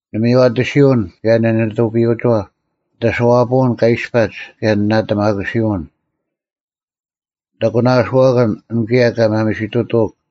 ᓂᒥᔽᑎᓯᐅᓐ, ᑭᔭ ᓂᓂᑐᐱᔪᐅᒋᐛᑉ; ᓂᑦ ᐊᓱᐛᐳᐅᓐ ᑲ ᐃᔅᐸᒡ, ᑭᔭ ᓂ ᓇᑎᒪᑯᓯᐅᓐ; ᓂᑦ ᐊᒂᓇᐅᓱᐛᑭᓐ, ᐊᓐ ᑭᔭ ᑲ ᒪᒥᓯᑐᑐᐅᒃ;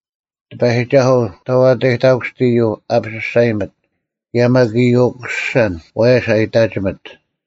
ᑎᐸᔨᒋᒐᓱᐤ, ᑕᓐ ᐊᑕᔨᑕᑯᓯᑦ ᐃᔪᐤ ᐊᐱᔅᒐᔨᒥᑦ? ᑭᔭ ᒪᒃ ᐃᔪᐤ ᐅᑯᓯᓴᓐ, ᐛᔭᔅ ᐊ ᐃᑕᒋᒥᑦ?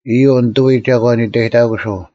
ᐃᔪᐤ ᓂᑐᐎ ᒐᒂᓐ ᐃᑕᔨᑕᑯᓱᐤ: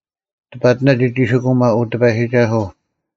ᑕᐸᑎᓇ ᒋᒋᒋᓯᑯᒪ, ᐅ ᑎᐸᔨᒋᒐᓱᐤ,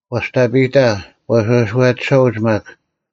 ᐛᔅᑕᐱᑕ, ᐛᓴᔄᑎᓴᐅᒡ ᒪᒃ;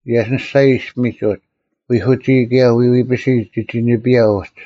ᔭᓯᓂᔅᒐᔨ ᐃᔅᐱᒥᒡ ᐅᒡ; ᐎᐧᑯᒋᐃ, ᑭᔭ ᐎᐎᐱᓯ ᒋᒋ ᓂᐱᔭ ᐅᒡ,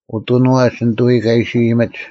ᐅᑐᓄᐛᒡ ᓂᑐᐎ ᑲ ᐃᓯ ᐃᔨᒥᒡ,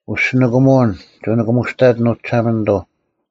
ᐅᔅᒋ ᓂᑭᒧᐅᓐ ᒋᑭ ᓂᑭᒧᔅᑕᑎᓐ, ᐅ ᒋᓴᒪᓂᑐᐤ;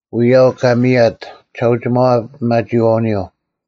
ᐎᔾ ᐊᐅᒄ ᑲ ᒥᔭᑦ ᒋᓴᐅᒋᒪᐛ ᐱᒪᒋᐃᐛᐅᓂᔪᐤ: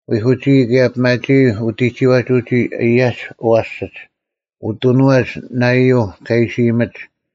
ᐎᐧᑯᒋᐃ, ᑭᔭ ᐱᒪᒋᐃ ᐅᑎᒋᐛᒡ ᐅᒋ ᐊᔭᒡ ᐊᐛᓯᓯᒡ, ᐅᑐᓄᐛᒡ ᓂᔪᐎ ᑲ ᐃᓯ ᐃᔨᒥᒡ,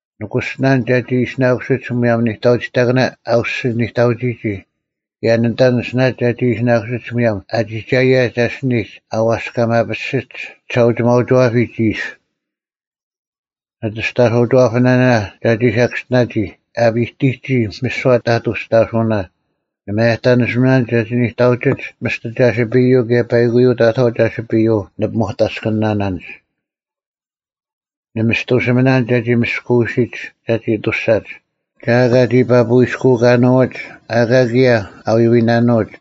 ᓂᑯᓯᓇᓐᒡ ᒐᒋ ᐃᓯᓇᑯᓯᒡ ᒧᔭᒻ ᓂᑕᐅᒋᑕᑭᓇ ᐊ ᐅᔅᒋ ᓂᑕᐅᒋᒋ; ᑭᔭ ᓂᑕᓂᓯᓇᓐᒡ ᒐᒋ ᐃᓯᓇᑯᓯᒡ ᒧᔭᒻ ᐊ ᒋᒐᔭᔨᒡ ᐊᓯᓂᒡ ᐊ ᐛᔅᑲᒪᐱᔅᒋᓯᒡ ᒋᒋᓴᐅᒋᒪᐅᒋᐛᐱᒡ ᐃᓯ; ᓂᑦ ᐊᔅᑕᓱᐅᒋᐛᐱᓇᓇ ᒐᒋ ᓴᑭᔅᒋᓇᔨᒋ, ᐊ ᐱᒋᑎᒋ ᒥᓯᐛ ᑕᑐ ᐊᔅᑕᓱᐅᓇ; ᓂ ᒪᔭᑕᓂᓯᒥᓇᓐᒡ ᒐᒋ ᓂᑕᐅᒋᒡ ᒥᔅᑎ ᒐᓯᐱᔪᐤ ᑭᔭ ᐸᐃᑯᔪᐤ ᑕᑥᐤ ᒐᓯᐱᔪᐤ ᓂ ᐱᒧᑕᔅᑭᓇᓇᒡ; ᓂ ᒥᔅᑐᓱᒥᓇᓐᒡ ᒐᒋ ᒥᔅᑯᐅᓯᒡ ᒐᒋ ᐊᑐᔅᒐᒡ; ᒐ ᐊᑲ ᒋ ᐸᐱᔨᔅᑯᐃᑲᓂᐅᒡ, ᐊᑲ ᑭᔭ ᐊ ᐎᐎᓇᓄᐅᒡ;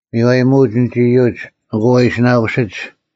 ᒥᔽᔨᒧᐅᒡ ᐊᓐᒡ ᐃᔪᒡ, ᐊᑯ ᐃᓯᓇᑯᓯᒡ;